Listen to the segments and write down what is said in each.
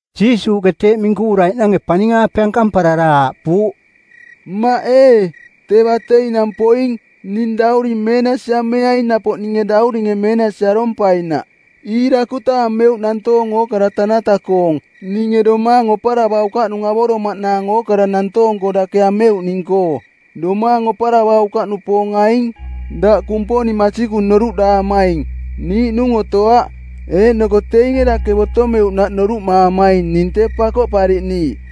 Jiisuuꞌke teeꞌ minkuvuraiꞌnange paning-aape ankamparara aaꞌpuuꞌ, “Mmaꞌ ee, tee bateinang poing. Ning dauring meenasi ameaing napoꞌ ninge dauringe meenasi arompainaꞌ. Iirakuta ameuꞌ nantoong ookara tanata-koong ninge domaang oparavaukaꞌnung avoromaꞌnaang ookara nantoong-koo dake ameuꞌning-koo. Domaang oparavaukaꞌnupoong aing: Daꞌ Kumponing masikung noruꞌdaamaing, niiꞌnung otoaꞌ, eeꞌnoko teinge dake botomeuꞌnaꞌ noruꞌmaamaing ning tee Pakoꞌpariꞌniiꞌ.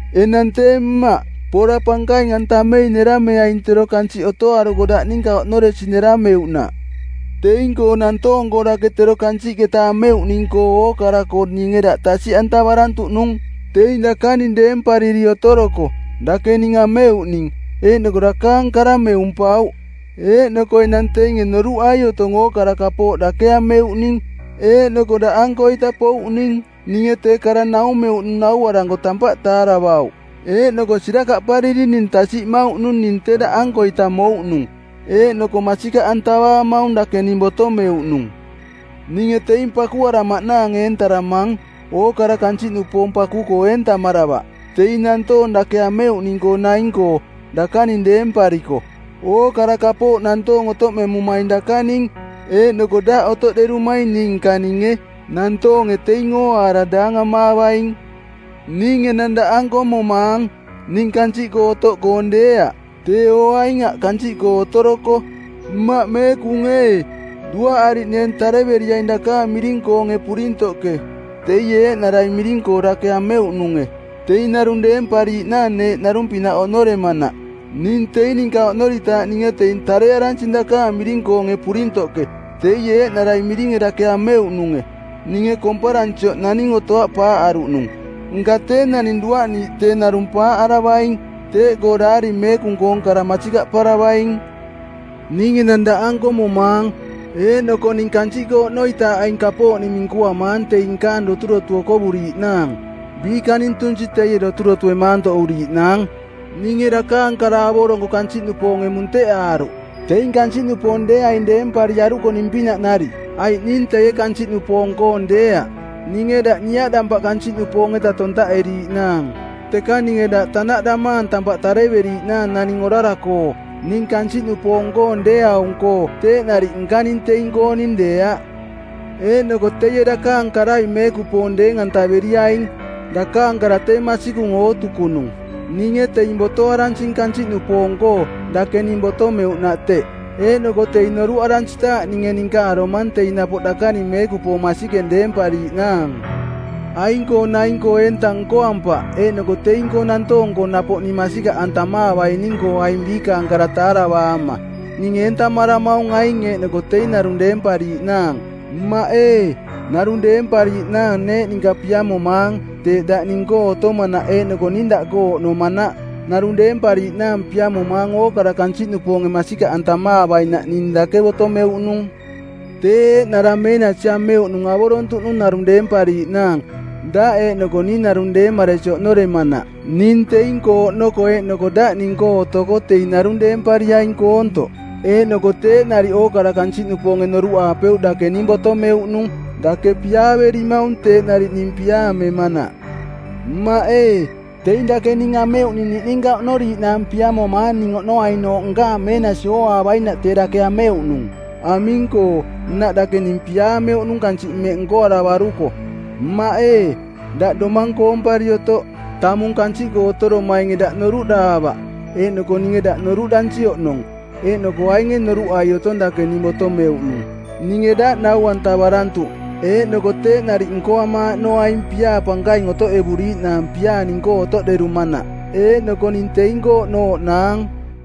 Enang tee Mmaꞌ, pora pankaing-antamei nerameaing tero kansiꞌ otoaruko daꞌ ninka oꞌnoresi nerameuꞌnaꞌ. Teing-koo nantoong-koo dake tero kansiꞌketa ameuꞌning-koo ookara-koo ninge daꞌ tasiꞌantavarantuꞌnung. Teing dakaning deempariri otoroko, dake ning ameuꞌning, eeꞌnoko dakaang kara meumpauꞌ. Eeꞌnoko enang teinge noruꞌai otong ookara kapooꞌ dake ameuꞌning eeꞌnoko daꞌankoita pouꞌning. Ninge tee kara naumeuꞌnung nauaranko tampaꞌ taaravauꞌ, eeꞌnoko sirakaꞌpariri ning tasiꞌmauꞌnung ning tee daꞌankoita mouꞌnung, eeꞌnoko masikaꞌantavaamaung dake ning botomeuꞌnung. “Ninge teing pakuaramaꞌnaang eentaramang. Ookara kansiꞌnupoong paku-koo eentamaravaꞌ, teing nantoong dake ameuꞌning-koo naing-koo, dakaning deempariko. Ookara kapooꞌ nantoong otoꞌmemumaing dakaning, eeꞌnoko daꞌ otoꞌderumaing ning nkaninge. Nantoonge teing ooaara daangamaavaing. Ning enang daꞌanko momaang. Ning kansiꞌkoo otoꞌkoong deeaꞌ, teeo aing aꞌ kansiꞌkoo otoroko. Mmaꞌ meekung ee, duaꞌariꞌneeng tareveriaing dakaang miring-koonge purintoꞌke, teie eeꞌnarai miring-koo dake ameuꞌnunge, teing narung deempariiꞌnaang neeꞌ narung-pinaꞌ oꞌnoremanaꞌ. Ning teing ninka oꞌnoritaaꞌ ninge teing tarearansing dakaang miring-koonge purintoꞌke, teie eeꞌnarai miringe dake ameuꞌnunge. Ninge komparansioꞌ naning otoaꞌ paaꞌaruꞌnung, nka tee naning duaꞌniiꞌ tee narung paaꞌaravaing; teꞌkoo Daari Meekung-koong kara masikaꞌparavaing. Ning enang daꞌanko momaang. Eeꞌnoko ning kansiꞌkoo oꞌnoitaaꞌ aing kapooꞌning minkuamaang teing nkaang doturotu okovuriiꞌnaang, biikaning tunsi teie doturotue maantoꞌuriiꞌnaang. Ninge dakaang kara avoronko kansiꞌnupoonge munteꞌaaruꞌ, teing kansiꞌnupoong deeaing deempariaruko ning pinaꞌ nariꞌ, aiꞌ ning teie kansiꞌnupoong-koong deeaꞌ. Ninge daꞌ niaꞌdampaꞌ kansiꞌnupoong-eta tontaꞌeriiꞌnaang, teka ninge daꞌ tanaꞌdamaang tampaꞌ tareveriiꞌnaang naning orara-koo. Ning kansiꞌnupoong-koong deeaung-koo teeꞌ nariꞌ nkaning teing-kooning deeaꞌ. Eeꞌnoko teie dakaang karai meekupoong deeng-antaveriaing. Dakaang kara tee masikung ootukunung. Ninge teing botoaransing kansiꞌnupoong-koo, dake ning botomeuꞌnaꞌ teꞌ. Eeꞌnoko teing noruꞌaransitaaꞌ ninge ninka aromang teing napoꞌ dakaning meekupoong masikeng deempariiꞌnaang. “Aing-koo naing-koo eenta nkoampaꞌ eeꞌnoko teing-koo nantoong-koo napoꞌ ning masikaꞌantamaavaining-koo aing biikaang kara taaravaama. Ning eentamaramaung aing eeꞌnoko teing narung deempariiꞌnaang. Mmaꞌ ee, narung deempariiꞌnaang neeꞌ ninka piamomaang teeꞌ daꞌ ning-koo otomanaꞌ eeꞌnoko ning daꞌkoo oꞌnomanaꞌ. Narung deempariiꞌnaang piamomaang ookara kansiꞌnupoonge masikaꞌantamaavainaꞌ ning dake botomeuꞌnung. Tee eeꞌnara meenasi ameuꞌnung avorontuꞌnung narung deempariiꞌnaang, daꞌ eeꞌnoko ning narung deemaresi oꞌnoremanaꞌ. Ning teing-koo oꞌnoko eeꞌnoko daꞌ ning-koo otoko teing narung deempariaing koontoꞌ. Eeꞌnoko teeꞌ nariꞌ ookara kansiꞌnupoonge noruꞌaapeuꞌ dake ning botomeuꞌnung, dake piaaverimaung teeꞌ nariꞌ ning piaamemanaꞌ. “Mmaꞌ ee, teing dake ning ameuꞌning niꞌninka oꞌnoriiꞌnaang piamomaang ning oꞌnoainooꞌ nkaang meenasi ooaavainaꞌ tee dake ameuꞌnung. Aming-koo, nnaꞌ dake ning piaameuꞌnung kansiꞌ mmeꞌ nkoaravaruko. Mmaꞌ ee, daꞌ domang koompari otoꞌ. Tamung kansiꞌkoo otoromainge daꞌ noruꞌdaavaꞌ, eeꞌnoko ninge daꞌ noruꞌdansi oꞌnong, eeꞌnoko ainge noruꞌai otong dake ning botomeuꞌnung. Ninge daꞌ nau-antavarantuꞌ, eeꞌnoko teeꞌ nariꞌ nkoamaaꞌnoaing piaa pankaing otoꞌevuriiꞌnaang piaa ning-koo otoꞌderumanaꞌ, eeꞌnoko ning teing-koo oꞌnooꞌnaang.”